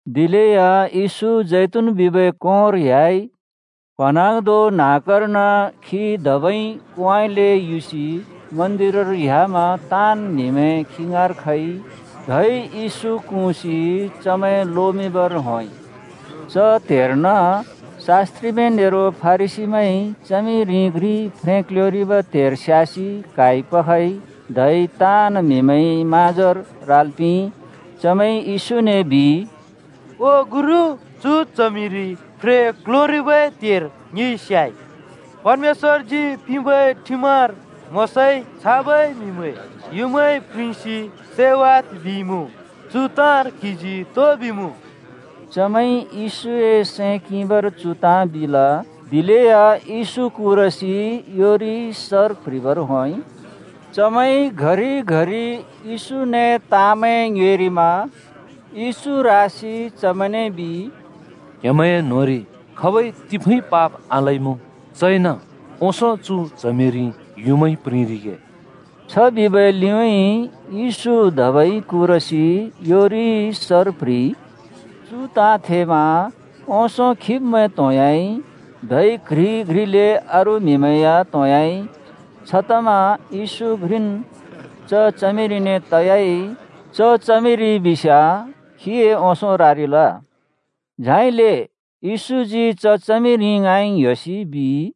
दिलेया येशू जैतून बिबै कोंर ह्‍याइ। प्‍हँन्हाँग्धों न्‍हाँक्‍कर्न खी धबै कोंउँइँले युसि मन्दिरर ह्‍यामा ताँन् म्हिमैं खी ङाँर खइ। धै येशू क्हुँसि चमैं लोमिंर होंइ। च त्हेर्न शास्‍त्रिमैं नेरो फरिसीमैंइ च्हमिरि घ्रि फ्रें क्ल्योंरिबै त्हेर स्‍यासि क्हाइ पखइ, धै ताँन् म्हिमैंए म्हाँजोर राल् पिंइ। चमैंइ यशूने बिइ, “ओ गुरु, चु च्हमिरि फ्रें क्ल्योंरिबै त्हेर ङिइ स्‍याइ। परमेश्‍वरजी पिंबै ठिमर मोशाइ छाबै म्हिमैं युँमाइ प्रिंसि सैवाद् बिइमुँ। चु ताँर क्‍हिजी तो बिमुँ?” चमैंइ येशूए सैं किंबर चु ताँ बिल। दिलेया येशू कुरसि योरिइ सर प्ह्रिबर होंइ। चमैंइ घरि-घरि येशूने ताँमैं ङ्योएरिमा येशू रासि चमैंने बिइ, “क्‍हेमैंए न्‍होंरि खाबइ तिफुँइ पाप आलइमुँ, चइन ओंसों चु च्हमिरि युँमाइ प्रिंरिगे।” छ बिबै लिउँइँ येशू धबै कुरसि योरिइ सर प्‍ह्रिइ। चु ताँ थेमा ओंसों खिब्मैं त्होंह्‍याइ, धै घ्रि घ्रिले अरू म्हिमैं या त्होंह्‍याइ। छतमा येशू घ्रिन् च च्हमिरिने तयाइ, च च्हमिरि बिस्याँ खीए ओंसों रारिल। झाइले येशूजी च च्हमिरि ङाँइ ङ्‍ह्‍योसि बिइ,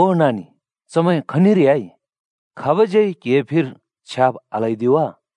“ओ नानि, चमैं खनिर ह्‍याइ? खाबज्यै क्हिए फिर छ्याब् आल्हैदि वा?”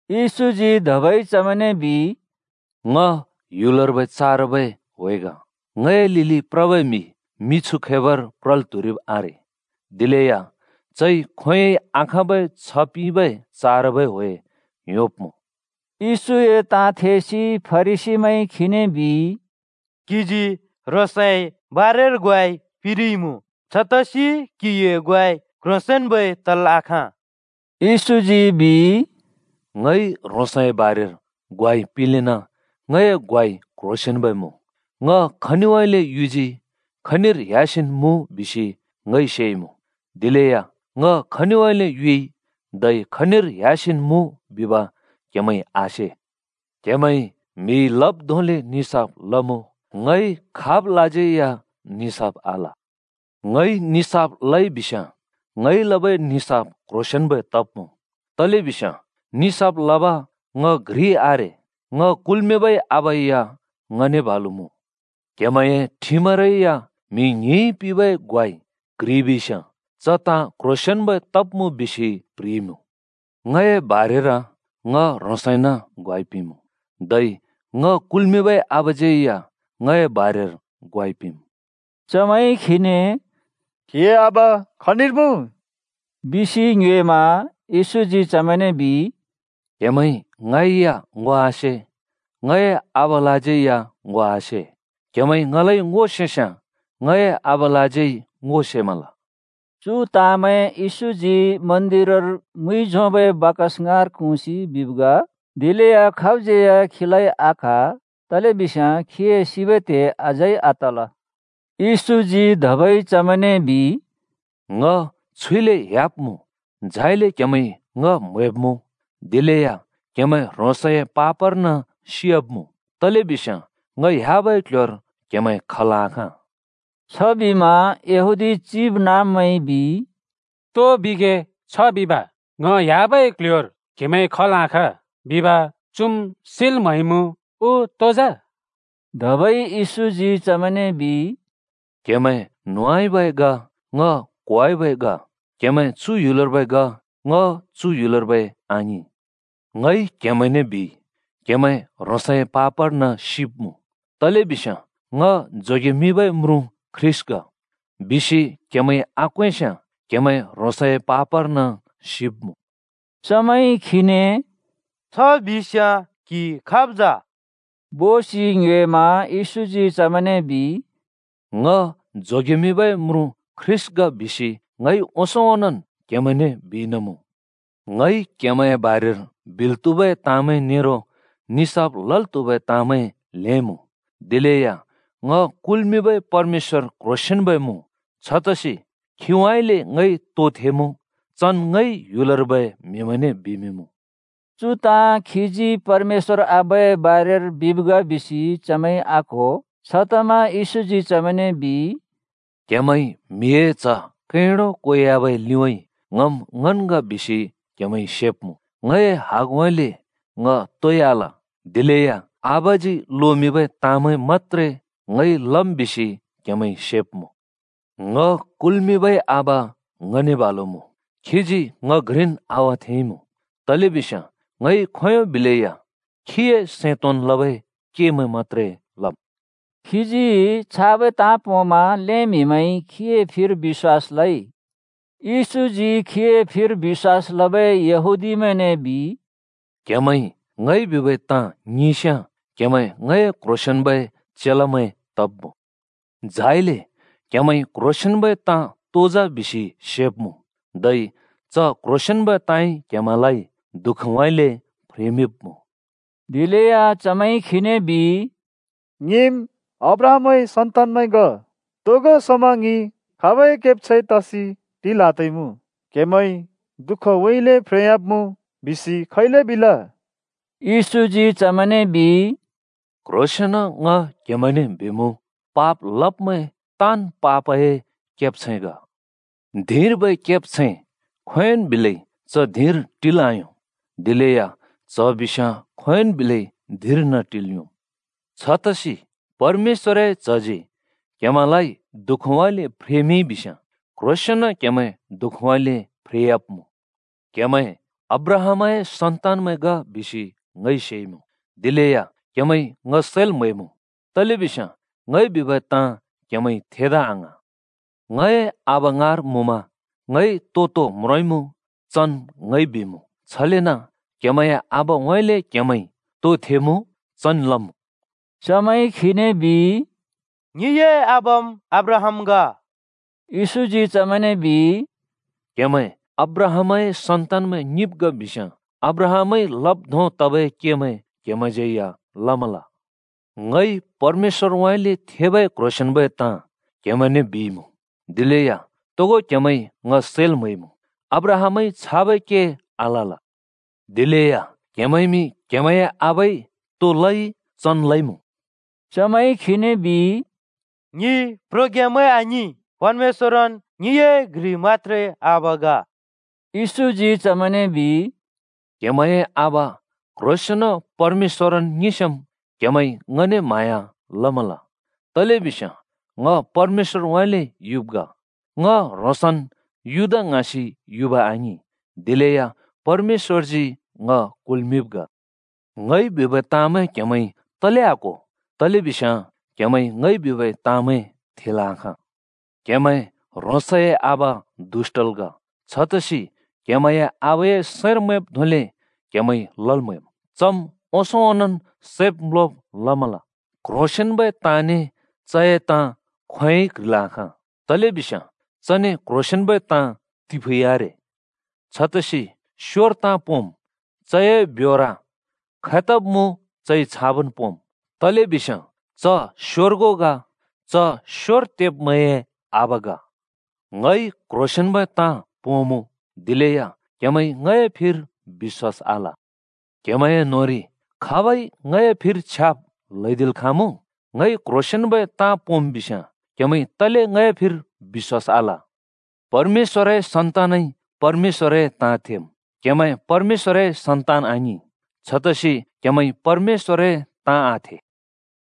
येशूजी धबै चमैंने बिइ, “ङ ह्‍युलर्बै चारबै ह्‍वे ग। ङए लिलि प्रबै म्हि मिछु खैबर प्रल् त्‍हुरिब् आरे। दिलेया चइ खोंयोंइ आखाँबै छ्ह पिंबै चारबै ह्‍वे योंब्‍मुँ।” येशूए ताँ थेसि फरिसीमैंइ खीने बिइ, “क्‍हिजी ह्रोंसए बारेर ग्वाइ पिंरिइमुँ। छतसि क्‍हिए ग्वाइ क्‍ह्रोंसेंन्‍बै तल् आखाँ।” येशूजी बिइ, “ङइ ह्रोंसए बारेर ग्वाइ पिंलेना ङए ग्वाइ क्ह्रोंसेंन्बै मुँ। ङ खनिउँइँले युजी खनिर ह्‍यासिन् मुँ बिसि ङइ सेइमुँ, दिलेया ङ खनिउँइँले युइ धै खनिर ह‍यासिन् मुँ बिब क्हेमैंइ आसे। क्‍हेमैंइ म्हिइ लब् धोंले निसाफ लमुँ, ङइ खाबलाज्यै या निसाफ आल। ङइ निसाफ लइ बिस्याँ ङइ लबै निसाफ क्ह्रोंसेंन्बै तब्मुँ, तलेबिस्याँ निसाफ लब ङ घ्रि आरे, ङ कुल्मिंबै आबा या ङने बालु मुँ। क्हेमैंए ठिमरै या म्हि ङ्हिंइ पिंबै ग्वाइ क्ह्रिबिस्याँ च ताँ क्ह्रोंसेंन्बै तब्मुँ बिसि प्ह्रिइमुँ। ङए बारेर ङ ह्रोंसइन ग्वाइ पिंमुँ, धै ङ कुल्मिंबै आबाज्यै या ङए बारेर ग्वाइ पिंमुँ।” चमैंइ खीने “क्‍हिए आबा खनिर मुँ?” बिसि ङ्योएमा येशूजी चमैंने बिइ, “क्‍हेमैंइ ङै या ङो आसे, ङए आबालाज्यै या ङो आसे। क्‍हेमैंइ ङलाइ ङो सेस्‍याँ ङए आबालाज्यै ङो सेमल।” चु ताँमैं येशूजी मन्दिरर मुइ झोंबै बाकस ङाँर क्हुँसि बिब् ग। दिलेया खाबज्‍यै या खीलाइ आक्‍हा। तलेबिस्याँ खीए सिबै त्हे अझै आतल। येशूजी धबै चमैंने बिइ, “ङ छुइले ह्‍याब्मुँ, झाइले क्‍हेमैंइ ङ म्‍हैब्‍मुँ, दिलेया क्‍हेमैं ह्रोंसए पापर्न सियाब्मुँ। तलेबिस्याँ ङ ह्‍याबै क्ल्ह्‍योर क्‍हेमैं खल् आखाँ।” छबिमा यहूदी चिबनाँब्मैंइ बिइ, “तो बिगे, छ बिब? ‘ङ ह्‍याबै क्ल्ह्‍योर क्हेमैं खल् आखाँ’ बिब चुम् सिल् म्हैमुँ उ तो जा?” धबै येशूजी चमैंने बिइ, “क्‍हेमैं न्होंउँइँबै ग। ङ क्‍होउँइँबै ग। क्‍हेमैं चु ह्‍युलर्बै ग। ङ चु ह्‍युलर्बै आङिं। ङइ क्हेमैंने बिइ, क्‍हेमैं ह्रोंसए पापर्न सिब्मुँ, तलेबिस्याँ ‘ङ जोगेमिंबै म्रुँ ख्रीष्‍ट ग’ बिसि क्हेमैंइ आक्वेंस्याँ क्हेमैं ह्रोंसए पापर्न सिब्मुँ।” चमैंइ खीने “छ बिस्‍याँ क्‍हि खाब जा?” बोसि ङ्योएमा येशूजी चमैंने बिइ, “ङ जोगेमिंबै म्रुँ ख्रीष्‍ट ग बिसि ङइ ओंसों ओंनोंन् क्हेमैंने बिइना मुँ। ङइ क्‍हेमैंए बारेर बिल् त्हुबै ताँमैं नेरो निसाफ लल् त्हुबै ताँमैं ल्हें मुँ। दिलेया ङ कुल्‍मिंबै परमेश्‍वर क्‍ह्रोंसेंन्‍ब मुँ, छतसि खीउँइँले ङइ तो थेमुँ चन् ङइ ह्‍युलर्बै म्हिमैंने बिमिंमुँ।” चु ताँ खीजी परमेश्‍वर आबाए बारेर बिब् ग बिसि चमैंइ आक्‍हो। छतमा येशूजी चमैंने बिइ, “क्‍हेमैंइ म्हिए च्‍ह कैंडो क्वेवाबै लिउँइँ ‘ङम् ङन् ग’ बिसि क्‍हेमैंइ सेब्‍मुँ, ङए हगउँइँले ङ तोइ आल, दिलेया आबाजी लोमिंबै ताँमैं मत्‍त्रे ङइ लम् बिसि क्हेमैंइ सेब्मुँ। ङ कुल्‍मिंबै आबा ङने बालुन् मुँ। खीजी ङ घ्रिन् आवाथेंइँमुँ, तलेबिस्याँ ङइ खोंयों बिलैया खीए सैं तोंन् लबै केमैं मत्‍त्रे लम्।” खीजी छाबै ताँ पोंमा ल्‍हें म्हिमैंइ खीए फिर बिश्‍वास लइ। येशूजी खीए फिर बिश्‍वास लबै यहूदीमैंने बिइ, “क्‍हेमैंइ ङइ बिबै ताँ ङिंस्‍याँ क्‍हेमैं ङए क्‍ह्रोंसेंन्‍बै चेलामैं तब्‍मुँ। झाइले क्हेमैंइ क्‍ह्रोंसेंन्बै ताँ तो जा बिसि सेब्मुँ, धै च क्ह्रोंसेंन्बै ताँइ क्हेमैंलाइ दुःखउँइँले फ्रेमिंब्मुँ।” दिलेया चमैंइ खीने बिइ, “ङिम् अब्राहामए सन्तानमैं ग। तोगो समा ङि खाबै केब्छैं तसि टिल् आत्हुइमुँ। ‘क्हेमैं दुःखउँइँले फ्रेयाब्मुँ’ बिसि खैले बिल?” येशूजी चमैंने बिइ, “क्ह्रोंसेंन ङ क्हेमैंने बिमुँ, पाप लब्मैं ताँन् पापए केब्छैं ग। धिंर्बै केब्छैं खोंयोंन् बिलै च धिंर टिल् आयों, दिलेया च्‍ह बिस्याँ खोंयोंन् बिलै धिंर्न टिल् योंम्। छतसि परमेश्‍वरए च्‍हजी क्हेमैंलाइ दुःखउँइँले फ्रेमिंइ बिस्याँ क्ह्रोंसेंन क्हेमैं दुःखउँइँले फ्रेयाब्मुँ। क्‍हेमैं अब्राहामए सन्तानमैं ग बिसि ङइ सेइमुँ। दिलेया क्‍हेमैंइ ङ सैल् म्हैमुँ, तलेबिस्याँ ङइ बिबै ताँ क्‍हेमैंइ थेदा आङ्हाँ। ङए आबा ङाँर मुँमा ङइ तो-तो म्रोंइँमुँ, चन् ङइ बिमुँ। छलेन क्‍हेमैंए आबाउँइँले क्‍हेमैंइ तो थेमुँ चन् लमुँ।” चमैंइ खीने बिइ, “ङिए आबाम् अब्राहाम ग।” येशूजी चमैंने बिइ, “क्‍हेमैं अब्राहामए सन्तानमैं ङिंब् ग बिस्‍याँ अब्राहामइ लब् धों तबै केमैं क्‍हेमैंज्‍यै लमल। ङइ परमेश्‍वरउँइँले थेबै क्ह्रोंसेंन्बै ताँ क्हेमैंने बिइमुँ, दिलेया तोगो क्‍हेमैंइ ङ सैल् म्हैइमुँ। अब्राहामइ छाबै के आलल। दिलेया क्‍हेमैंइमि क्‍हेमैंए आबाइ तो लइ चन् लइमुँ।” चमैंइ खीने बिइ, “ङि प्रोग्यामैं आङिं! परमेश्‍वरन् ङिए घ्रि मत्‍त्रे आबा ग।” येशूजी चमैंने बिइ, “क्‍हेमैंए आबा क्‍ह्रोंसेंन परमेश्‍वरन् ङिंस्‍याँम् क्‍हेमैंइ ङने म्हाँया लमल, तलेबिस्याँ ङ परमेश्‍वरउँइँले युब् ग। ङ ह्रोंसन् युदा ङ्हाँसि युब आङिं, दिलेया परमेश्‍वरजी ङ कुल्मिंब् ग। ङइ बिबै ताँमैं क्‍हेमैंइ तले आक्‍हो? तलेबिस्याँ क्हेमैंइ ङइ बिबै ताँमैं थेल् आखाँ। क्‍हेमैं ह्रोंसए आबा दुष्‍टल् ‍ग। छतसि क्‍हेमैंए आबाए सैंर मैंब् धोंले क्हेमैंइ लल् म्हैम्। चम् ओंसों ओंनोंन् सैब् म्‍लोब लमल। क्‍ह्रोंसेंन्‍बै ताँने चए ताँ खोंयोंन् बिलै क्ह्रिल् आखाँ। तलेबिस्याँ चने क्ह्रोंसेंन्बै ताँ तिफुँइ आरे। छतसि स्‍योर ताँ पोंम्, चए ब्योर खैतब् मुँ चइ छाबन् पोंम्, तलेबिस्याँ च स्‍योर्गु ग, च स्‍योर तेब्‍मैंए आबा ग। ङइ क्‍ह्रोंसेंन्‍बै ताँ पोंमुँ, दिलेया क्‍हेमैंइ ङए फिर बिश्‍वास आल। क्‍हेमैंए न्‍होंरि खाबइ ङए फिर छ्याब् ल्हैदिल् खाँमुँ? ङइ क्ह्रोंसेंन्बै ताँ पोंम् बिस्याँ क्हेमैंइ तले ङए फिर बिश्‍वास आल? परमेश्‍वरए सन्तानइ परमेश्‍वरए ताँ थेम्। क्‍हेमैं परमेश्‍वरए सन्तान आङिं। छतसि क्हेमैंइ परमेश्‍वरए ताँ आथे।”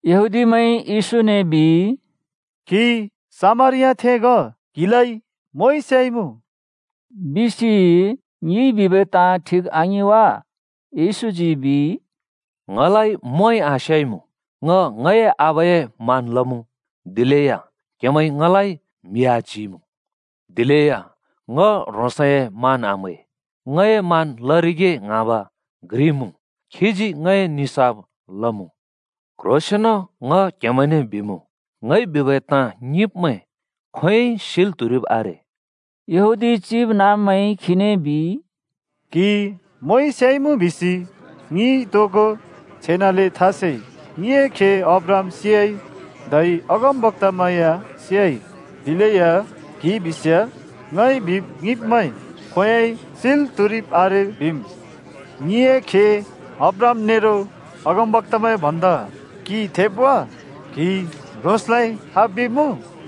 यहूदीमैंइ येशूने बिइ, “क्‍हि सामरियाथें ग, क्हिलाइ मोंइ स्याइमुँ?” बिसि ङिइ बिबै ताँ ठिक आङिं वा? येशूजी बिइ, “ङलाइ मोंइ आस्‍याइमुँ। ङ ङए आबाए मान लमुँ, दिलेया क्‍हेमैंइ ङलाइ म्हि आच्‍हिइमुँ। दिलेया ङ ह्रोंसए मान आम्है, ङए मान लरिगे ङ्हाँब घ्रि मुँ खीजी ङए निसाफ लमुँ। क्ह्रोंसेंन ङ क्हेमैंने बिमुँ, ङइ बिबै ताँ ङिंब्मैं खोंयोंइ सिल् त्हुरिब् आरे।” यहूदी चिबनाँब्मैंइ खीने बिइ, “क्हि मोंइ स्‍याइमुँ बिसि ङिइ तोगो छेनाले था सेइ! ङिए खे अब्राहाम सियाइ, धै अगमबक्‍तामैं या सियाइ, दिलेया क्‍हि बिस्याँ ‘ङइ बिब् ङिंब्मैं खोंयोंइ सिल् त्हुरिब् आरे बिमुँ।’ ङिए खे अब्राहाम नेरो अगमबक्‍तामैं भन्दा क्हि थेब वा? क्‍हि ह्रोंसलाइ खाब् बिमुँ?”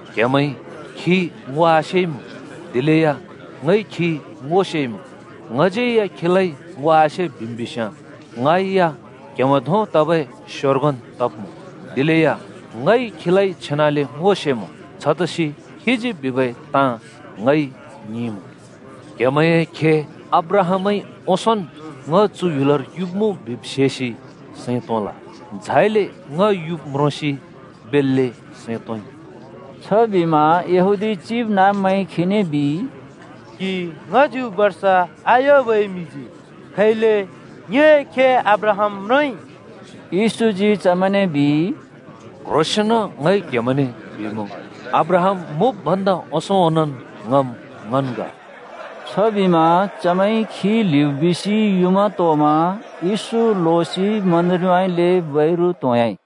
क्‍हेमैंइ खी ङो आसेइमुँ, दिलेया ङइ खी ङो सेइमुँ। ङज्यै या खीलाइ ङो आसे बिम् बिस्‍याँ ङै या क्‍हेमैं धों तबै स्‍योर्गुन् तब्मुँ। दिलेया ङइ खीलाइ छेनाले ङो सेमुँ, छतसि खीजी बिबै ताँ ङइ ङिंमुँ। क्‍हेमैंए खे अब्राहामइ ओंसोंन् ङ चु ह्‍युलर युब्मुँ बिब् सेसि सैं तोंल, झाइले ङ युब् म्रोंसि बेल्‍ले सैं तोंइ।” छबिमा यहूदी चिबनाँब्मैंइ खीने बिइ, “क्‍हि ङ्‍हच्‍यु बर्ष आयुबै म्हिजी खैले ङिए खे अब्राहाम म्रोंइ?” येशूजी चमेंने बिइ, “क्ह्रोंसेंन ङ क्हेमैंने बिमुँ, अब्राहाम मुँब् भन्दा ओंसों ओंनोंन् ङम् ङन् ग।” छबिमा चमैंइ खी ल्हिब बिसि युँमा तोमा येशू लोसि मन्दिरउँइँले बैरु त्‍होंयाइ।